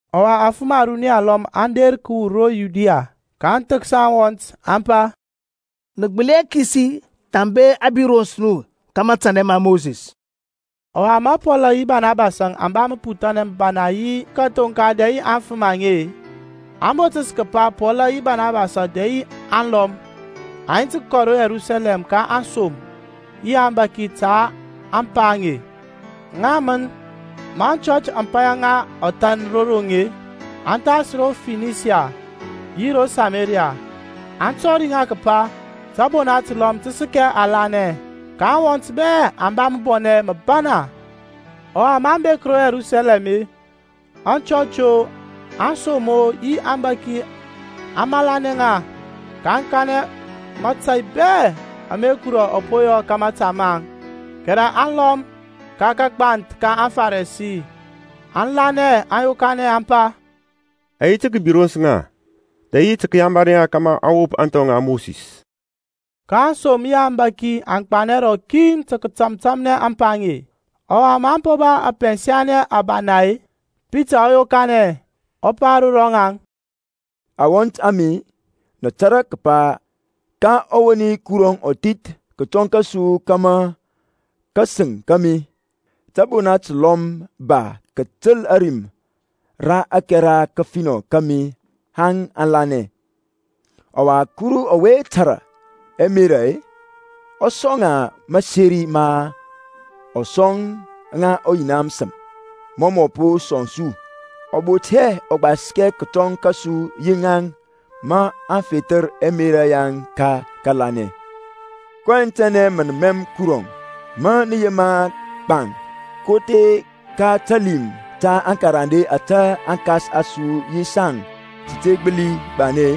Ɔwa afəm aruni alɔm aŋ der kəwur ro Yudia, ka aŋ thəksa aŋwɔnt, aŋ pa, Nə gbəli hɛ kisi thambe a birons nu ka matanɛ ma Mosis. Ɔwa ma Pɔlȧŋ yi Banabasȧŋ aŋ ba məputhanɛ məbana yi kəthoŋka dɛ yi aŋfəm aŋe-e, a botəs kəpa, Pɔl yi Barnabas dɛ yi ŋaŋ alɔm, aŋ yi tə kəkɔ ro Yerusalɛm ka aŋsom yi aŋbȧki ta ȧŋpa aŋe. Ŋaŋ mən, ma aŋchɔch aŋ paya ŋa ɔthan ro roŋ-e, aŋ thas ro Finisia yi ro Samaria, aŋ tɔri kəpa tȧbona təlɔm tə səkɛ alanɛ. Ka aŋwɔnt bɛ aŋ ba məbɔnɛ məbana. Ɔwa maŋ bek ro Yerusalɛm-e, aŋchɔch-o, aŋsom-o yi aŋbȧki aŋ malanɛ ŋa, kaŋ kanɛ mȧtȧy bɛ ama Kuru ɔ po yɔ ka mȧta maŋ. Kɛrɛ aŋlɔm ka kagbanth ka aŋFarisi aŋa lanɛ aŋ yokanɛ aŋ pa, A yi tə kəbirons ŋa, dɛ yi tə kəyamari ŋa tə kəwop ȧŋthɔ ŋa Mosis. Ka aŋsom yi aŋbȧki aŋ gbanɛ rɔkin tə kətȧmtȧmnɛ ȧŋpa aŋe. Ɔwa maŋ po ba ɛpɛnsanɛ ɛbana-e, Pitaŋ ɔ yokanɛ, ɔ pa ro rɔŋaŋ, Aŋwɔnt a mi, nə tȧrȧ kəpa ka ɔwoni Kuru ɔ thith kətɔŋ kȧsu kȧmȧ ka kȧsəŋ kȧmi tȧbona təlɔm tə ba kətəl ȧrim ra ȧkɛra kəfinɔ kȧmȧ aŋ lanɛ. Ɔwa Kurɔŋ ɔwe tȧrȧ ɛmerȧ-e, ɔ sɔŋ ŋa məseri ma ɔ sɔŋ ŋa ɔYina məsəm, mɔ mɔ po sɔŋ su. Ɔ bot hɛ ɔgbaskɛ kətɔŋ kȧsu yi ŋaŋ ma ɔ fethər ɛmerȧ yaŋ ka kȧlanɛ. kɔyɛŋ tɛnɛ mə nə mɛm Kurɔŋ, ma nə yema gbaŋ kothe ka talim ta aŋkarande ȧtȧ aŋkas a su yi saŋ sə te gbəli gbanɛ-e?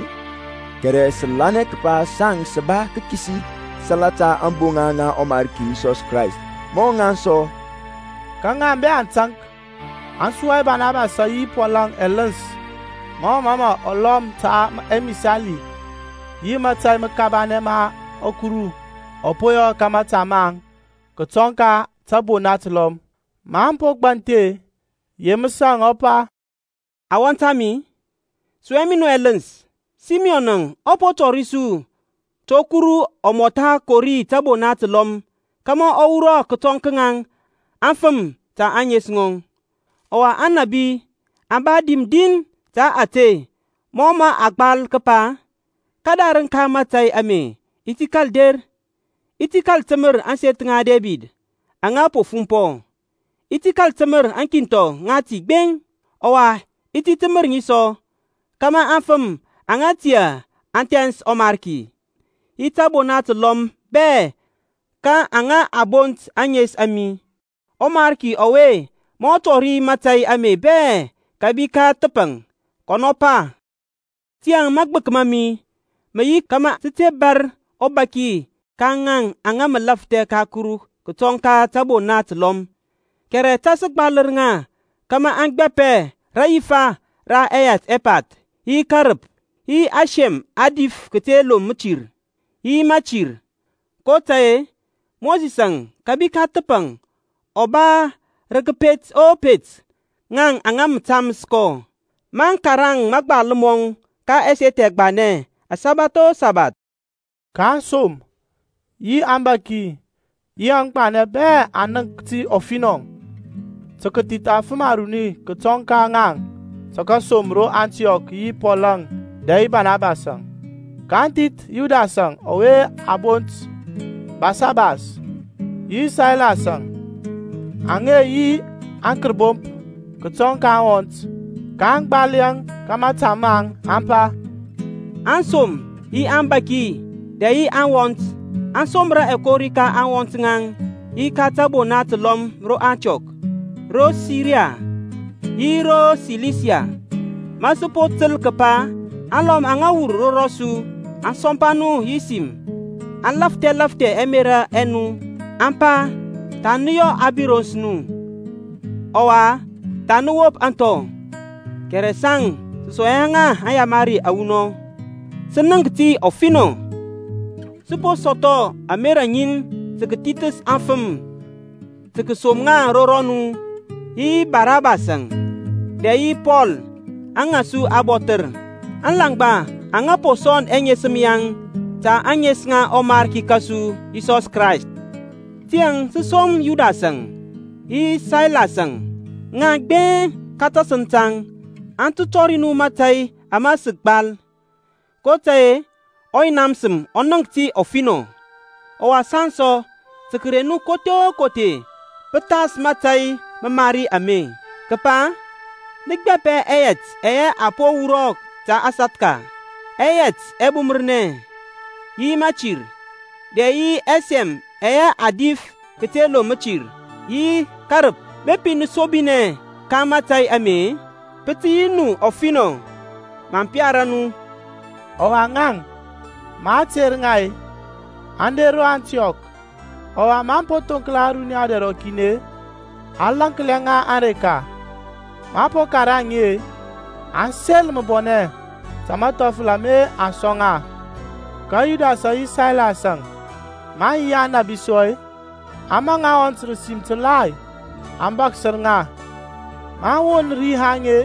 Kɛrɛ sə lanɛ kəpa saŋ sə ba kəkisi salata ȧŋboŋa ŋa ɔMarki Yisɔs Krayst mɔ ŋaŋ sɔ. Ka ŋaŋ bɛ aŋ taŋk, aŋ sua Banabasȧŋ yi Pɔlȧŋ ɛləns mɔ mə aŋ lɔm ta ɛmisali yi mȧtȧy məkabanɛ ama Kuru ɔ po yɔ ka mȧta maŋ kətɔŋ ka tȧbona təlɔm. Maŋ po gbanthi-e, Yeməsȧŋ ɔ pa, Aŋwɔnt a mi, sua mi nu ɛləns. Simiyɔn ɔ po tɔri su to Kurɔŋ ɔ mɔtha kori tȧbona təlɔm kȧmȧ ɔ wurɔ kətɔŋ ka ŋaŋ afəm ta ȧŋes ŋɔŋ. Ɔwa Aŋnȧbi aŋ ba dim din ta ȧte mɔ mə a gbal kəpa, Kədarəŋ ka mȧtȧy ame i ti kȧl der, I ti kȧl təmər ȧŋseth ŋa Debid aŋa po fumpɔ. I ti kȧl təmər aŋkinthɔ ŋati gbeŋ, Ɔwa i ti təmər ŋi sɔ, Kama aŋfəm aŋa tiyȧ aŋ thɛns ɔMarki, Yi tȧbona təlɔm bɛ ka aŋa a bont ȧŋes a mi, ƆMariki ɔwe mə tɔri mȧtȧy ame bɛ kȧbi ka thəpaŋ, kɔnɔ pa. Tiyȧŋ magbək ma mi mə yi kȧmȧ sə te bȧr ɔbaki ka ŋaŋ aŋa mə lafthɛ ka Kuru kətɔŋ ka tȧbona təlɔm, kɛrɛ ta sə gbalər ŋa kȧmȧ aŋ gbapɛ rayifa ra ɛyɛt ɛpath, yi kərəp, yi ɛsɛm a dif kəte loŋ mətir, yi mətir. kotȧy-e, Mosisȧŋ kȧbi ka thəpaŋ ɔ ba rə kəpet o pet ŋaŋ aŋa mə taməs kɔ, maŋ karaŋ mȧgbal mɔŋ ka ɛseth ɛgbanɛ asabath o sabath. Ka aŋsom, yi aŋbȧki, yi aŋgbanɛ bɛ aŋ nənk ti ɔfinɔ tə kəthith afəm aruni kətɔŋ ka ŋaŋ tə kəsom ro Antiɔk yi Pɔlȧŋ dɛ yi Banabasȧŋ, kaŋ thith Yudasȧŋ ɔwe a bont Basabas, yi Sailasȧŋ, aŋa yi aŋkərbomp kətɔŋ ka aŋwɔnt. kaŋ gbal yɛŋ ka mȧta maŋ, aŋ pa, Aŋsom yi aŋbȧki dɛ yi aŋwɔnt aŋ somra ɛkori ka aŋwɔnt aŋa yi ka tȧbona təlɔm ro Antiɔk, ro Siria, yi ro Silisia. Ma sə po təl kəpa alɔm aŋa wur ro rɔsu aŋ sɔmpa nu yi sim, aŋ lafthɛ lafthɛ ɛmerȧ ɛ nu, aŋ pa, Tha nə yɔ a birons nu, ɔwa tha nə wop ȧŋthɔ; kɛrɛ saŋ sə sɔŋ hɛ ŋa aŋyamari awunɔŋ. Sə nənk ti ɔfinɔ, sə po sɔthɔ ȧmerȧ ŋin tə kəthithəs afəm tə kəsom ŋa ro rɔnu yi Barnabas dɛ yi Pɔl aŋa su abɔthər, alaŋgba aŋa po sɔnd ɛŋesəm yaŋ ta ȧŋes ŋa ɔMarki kȧsu Yisɔs Krayst. Tiyȧŋ sə som Yudasȧŋ yi Sailas-əŋ; ŋaŋ gbeŋ ka tasəŋ taŋ aŋ tə tɔri nu mȧtȧy ama sə gbal. kotȧy-e ɔYina məsəm ɔ nənk ti ɔfinɔ, ɔwa saŋ sɔ, tə kəte reŋ nu kothe o kothe pəthas mȧtȧy məmari ame, kəpa nə gbapɛ ɛyɛt ɛyɛ a po wurɔ ta sathka, ɛyɛt ɛbumərnɛ, yi mətir, dɛ yi ɛsɛm aŋe a dif kəte loŋ mətir, yi kərəp. Bepi nə sobinɛ ka mȧtȧy ame-e, pə tə yi nu ɔfinɔ. Maŋ piar nu. Ɔwa ŋaŋ, ma a ter ŋa-e, aŋ der ro Antiɔk. Ɔwa maŋ po thoŋkla ȧruniya dɛr rɔkin-e, aŋ laŋklia ŋa ȧŋreka. Maŋ po karaŋ ŋi-e, aŋ sel məbɔnɛ ta mathɔfəl ama aŋ sɔŋ ŋa. Ka Yudasȧŋ yi Sailas-əŋ, maŋ yi Aŋnȧy sɔ-e, aŋ maŋ aŋwɔnt rə sim təlai, aŋ bȧksər ŋa. Maŋ won ri haŋ-e,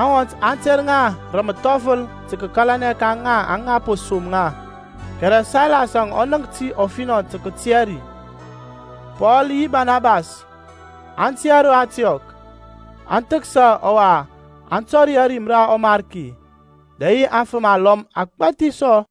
aŋwɔnt aŋ ter ŋa rə məthɔfəl tə kəkalanɛ ka ŋaŋ aŋa po som ŋa. Kɛrɛ Sailas-əŋ ɔ nənk ti ɔfinɔ tə kətia ri. Pɔl yi Barnabas aŋ tiyȧ ro Antiɔk, aŋ thəksa ɔwa aŋ tɔri ȧrim ra ɔMarki, dɛ yi afəm alɔm agbȧthi sɔ.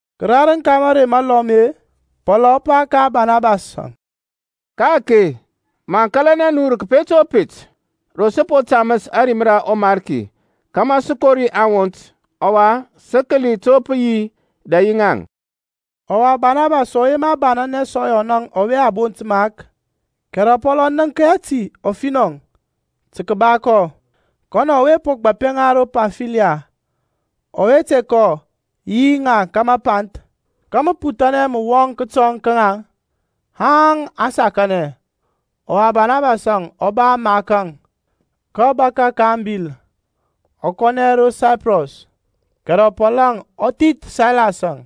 Kədarəŋ ka mərey məlɔm-e, Pɔlȧŋ ɔ pa ka Banabasȧŋ, Ka-ake maŋ kȧlanɛ nu rə kəpet o pet ro sə po taməs ȧrim ra ɔMarki kȧmȧ sə kori aŋwɔnt, ɔwa sə kəli to pə yi dɛ yi ŋaŋ. Ɔwa Barnabas ɔ yema banɛnɛ sɔ Yɔnȧŋ ɔwe a bont Mark. Kɛrɛ Pɔl ɔ nənk hɛ ti ɔfinɔ tə kəba kɔ, kɔnɔ ɔwe po gbapɛ ŋa ro Pamfiliya, ɔwe te kɔ yi ŋaŋ ka mapanth. Ka məputhanɛ mə wɔŋ kətɔŋ ka ŋaŋ, haŋ aŋ sakanɛ. Ɔwa Banabasȧŋ ɔ ba Mark-əŋ, kɔ bȧkȧ ka abil, ɔ kɔnɛ ro Saiprɔs. Kɛrɛ Pɔlȧŋ ɔ thith Sailas-əŋ,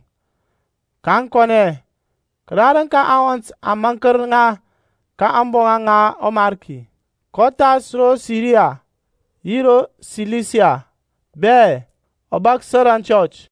kaŋ kɔnɛ, kərarəŋ ka aŋwɔnt aŋ maŋkər ŋa ka ȧŋboŋa ŋa ɔMarki. kɔ thas ro Siria yi ro Silisia bɛ, ɔ bȧksər ɛchɔch.